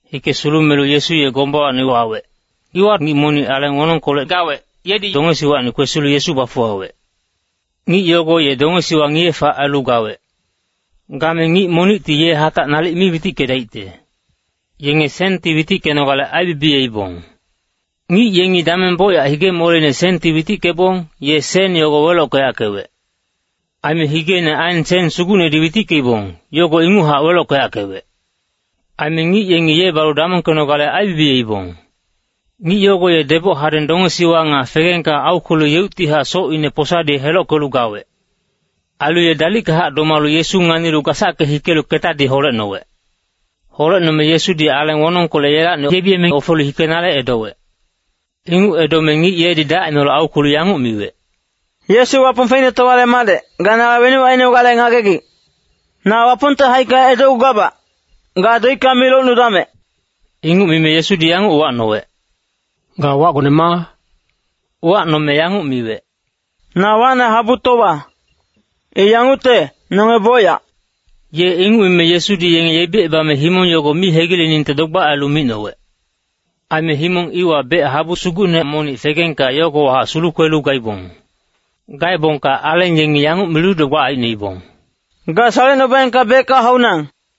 Hike sulumelu Yesu ye gombawacni wawec. Iwa ngic monic aleng wonongkolec gawec, yedi dongesiwacni kwesilu Yesu bafuwawec. Ngic yogo ye dongesiwa ngiye-fac ailu gawec. Game ngic monicti ye hatac nalic mi witickedaicte. Yenge senti witickenogale aibibiyeibong. Ngic yengi dameng bocyac hige-moleine senti witickebong, ye sen yogo welockeyackewec. Aime higeine aen sen sugucnedi witickeibong, yogo inguchac welockeyackewec. Aime ngic yenge ye balu damongkenogale aibibiyeibong. Ngic yogo ye deboc hadeng dongesiwa nga fegengka aukwelu yeuctihac socine posadi helockelu gawec. Ailu ye dalickahac domalu Yesu nganilu gasacke hikelu ketadi holecnowec. Holecnome Yesudi aleng wonongkolec yelacni yebiyeme ofelu hikenale edowec. Inguc edome ngic yedi dacineholec aukwelu yanguc miwec, “Yesu Wapong Feicnetowale Madec, ga nala wenuc ainogale ngagegic? Na Wapongte haicka edocgugabac, ga doicka mi locnudamec.” Inguc mime Yesudi yanguc uwacnowec, “Ga wacgone ma?” Uwacnome miwec, “Na wacne Habutowa. I yangucte, nonge bocyac.” Ye inguc mime Yesudi yenge yebicebame himong yogo mi hegileningte dogbac ailu micnowec. Aime himong iwa bec habu sugucne monic fegengka yogowahac sulukwelu gaibong. Gaebongka aleng yengi yanguc milu dogbac aicnoibong, “Ga salecnubaengka becka haunang.”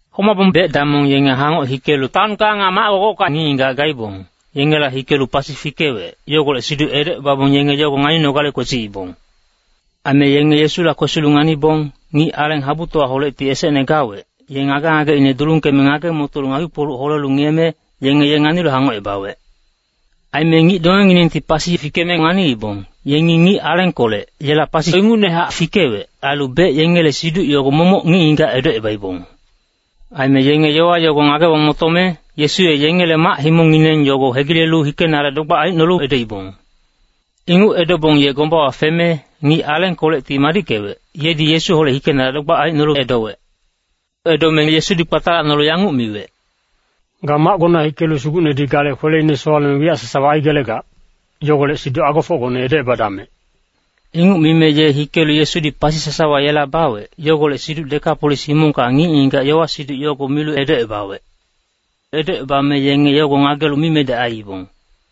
Homabong bec-damong yenge hangoc hikelu taonka nga mac-gogocka ngic-ngigac gaibong, yengela hikelu pasi fikewec, yogolec siduc edocebabong yenge yogo nganinogale kwesiibong. Aime yenge Yesula kwesilu nganibong, ngic aleng habutowaholecti esecne gawec, ye ngage-ngageine dulungkeme ngage-motolu ngakpi-kpoluc holelu ngiyeme, yenge ye nganilu hangocebawec. Aime ngic dongenginengti pasi fikeme nganiibong, yengi ngic alengkolec, yela pasi ingucnehac fikewec, ailu bec yengele siduc yogo momoc ngic-ngigac edocebaibong. Aime yenge yowa yogo ngagebong motome, Yesu ye yengele mac-himongngineng yogo hegilelu hikenale dogbac aicnolu edoibong. Inguc edobong ye gombawa feme, ngic alengkolecti madickewec, yedi Yesuholec hikenale dogbac aicnolu edowec. Edome Yesudi kpatalacnolu yanguc miwec, “Ga macgona hikelu Sugucnedi gale kweleine sowaleme wiyac sasawa aigelegac, yogolec siduc agofocgone edocebadamec.” Inguc mime ye hikelu Yesudi pasi sasawa yela bawec, yogolec siduc Dekapolis himongka ngic-ngigac yowa-siduc yogo milu edocebawec. Edocebame yenge yogo ngagelu mimedec aiibong.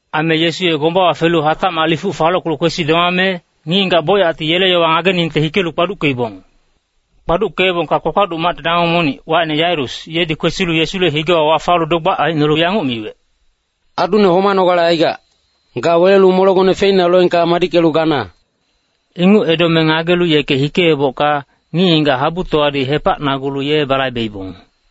Aime Yesu ye gombawa felu hatacmac lifuc falockelu kwesi domame, ngic-ngigac bocyacti yele yowa ngageningte hikelu kpaduckeibong. Kpaduckeebongka kpakpaduc macte damong monic, wacine Yairus, yedi kwesilu Yesule higewa wafalu dogbac aicnolu yanguc miwec, “Adune homanogale aigac. Ga welelu molegone feina loengka madickelu gana.” Inguc edome ngagelu yeke hikeebocka, ngic-ngigac habutowadi hepacnagulu ye balaibeibong.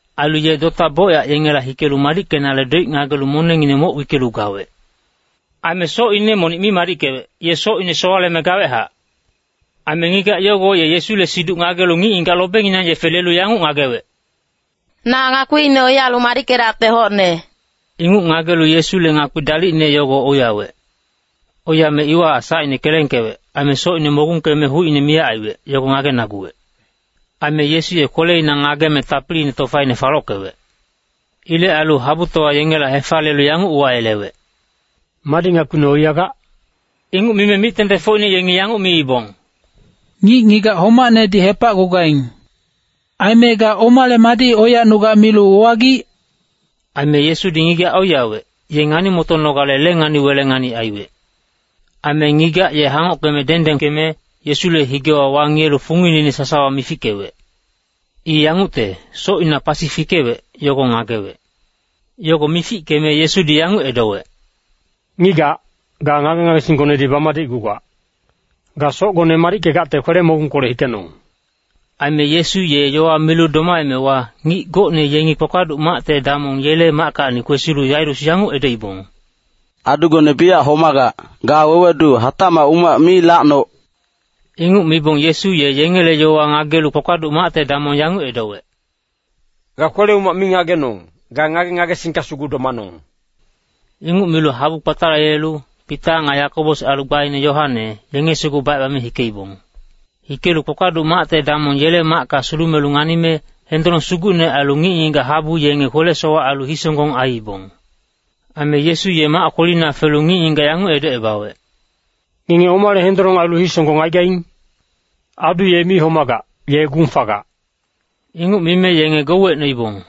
Ailu ye dota bocyac yengela hikelu madickenale doic ngagelu monengngine moc wickelu gawec. Aime socine monic mi madickewec, ye socine sowaleme gawechac. Aime ngigac yogo ye Yesule siduc ngagelu ngic-ngigac lobenginang yefe lelu yanguc ngagewec, “Na ngakpiine oiyalu madickedacte hocne.” Inguc ngagelu Yesule ngakpi dalicne yogo oiyawec. Oiyame iwahac sacine kelengkewec. Aime socine mogungkeme hucine miyac aiwec, yogo ngagenaguwec. Aime Yesu ye kweleina ngageme tapiliine tofaine falockewec. Ilec ailu habutowa yengela hefaliyelu yanguc uwayelewec, “Madi ngakpine oiyagac?” Inguc mime mic-tengtengfocine yengi yanguc miibong, “Ngic-ngigac homacnedi hepacgugaing. Aime ga omale madi oiyacnugac milu uwagic?” Aime Yesudi ngigac oiyawec, ye ngani-motonogale lengani-welengani aiwec. Aime ngigac ye hangockeme dengdengkeme, Yesule higewa wangiyelu fungineine sasawa mifickewec. I yangucte, socina pasi fikewec, yogo ngagewec. Yogo mifickeme Yesudi yanguc edowec, “Ngigac, ga ngage-ngagesinggonedi bamadicgugac. Ga socgone madickegacte kwele-mogungkolec hikenong!” Aime Yesu ye yowa milu domaemewa, ngic gocne yengi kpakpaduc macte damong yele mackacni kwesilu Yairus yanguc edoibong, “Adugone biyac homagac, ga wewedu hatacmac umac mi lacnoc!” Inguc mibong Yesu ye yengele yowa ngagelu kpakpaduc macte damong yanguc edowec, “Ga kwele-umac mi ngagenong, ga ngage-ngagesingka sugu domanong.” Inguc milu habu kpatalayelelu, Pita nga Yakobos ailu gbaine Yoane, yenge sugu bacebame hikeibong. Hikelu kpakpaduc macte damong yele macka sulumelu nganime, hendolong sugucne ailu ngic-ngigac habu yenge kwele-sowac ailu hisonggong aiibong. Aime Yesu ye mac kwelina felu ngic-ngigac yanguc edocebawec, “Ngenge omale hendolong ailu hisonggong aigaing? Adu ye mi homagac, ye gung fagac.” Inguc mime yenge gouwecnoibong.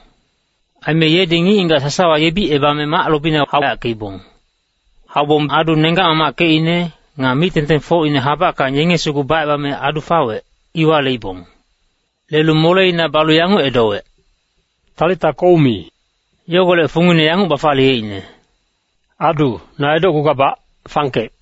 Aime yedi ngic-ngigac sasawa yebicebame mac lobina hauyackeibong. Haubong adu nenggac-mamackecine, nga mic-tengtengfocine habackang yenge sugu bacebame adu fawec, iwa leibong. Lelu moleina balu yanguc edowec, “Talita koumi!” Yogolec fungine yanguc bafaliyeicne, “Adu, na edocgugabac, fangkec.”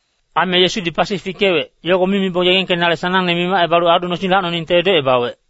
Aime Yesudi pasi fikewec, yogo mi mibong yegengkenale sanangne mimacebalu adu nosing lacnoningte edocebawec.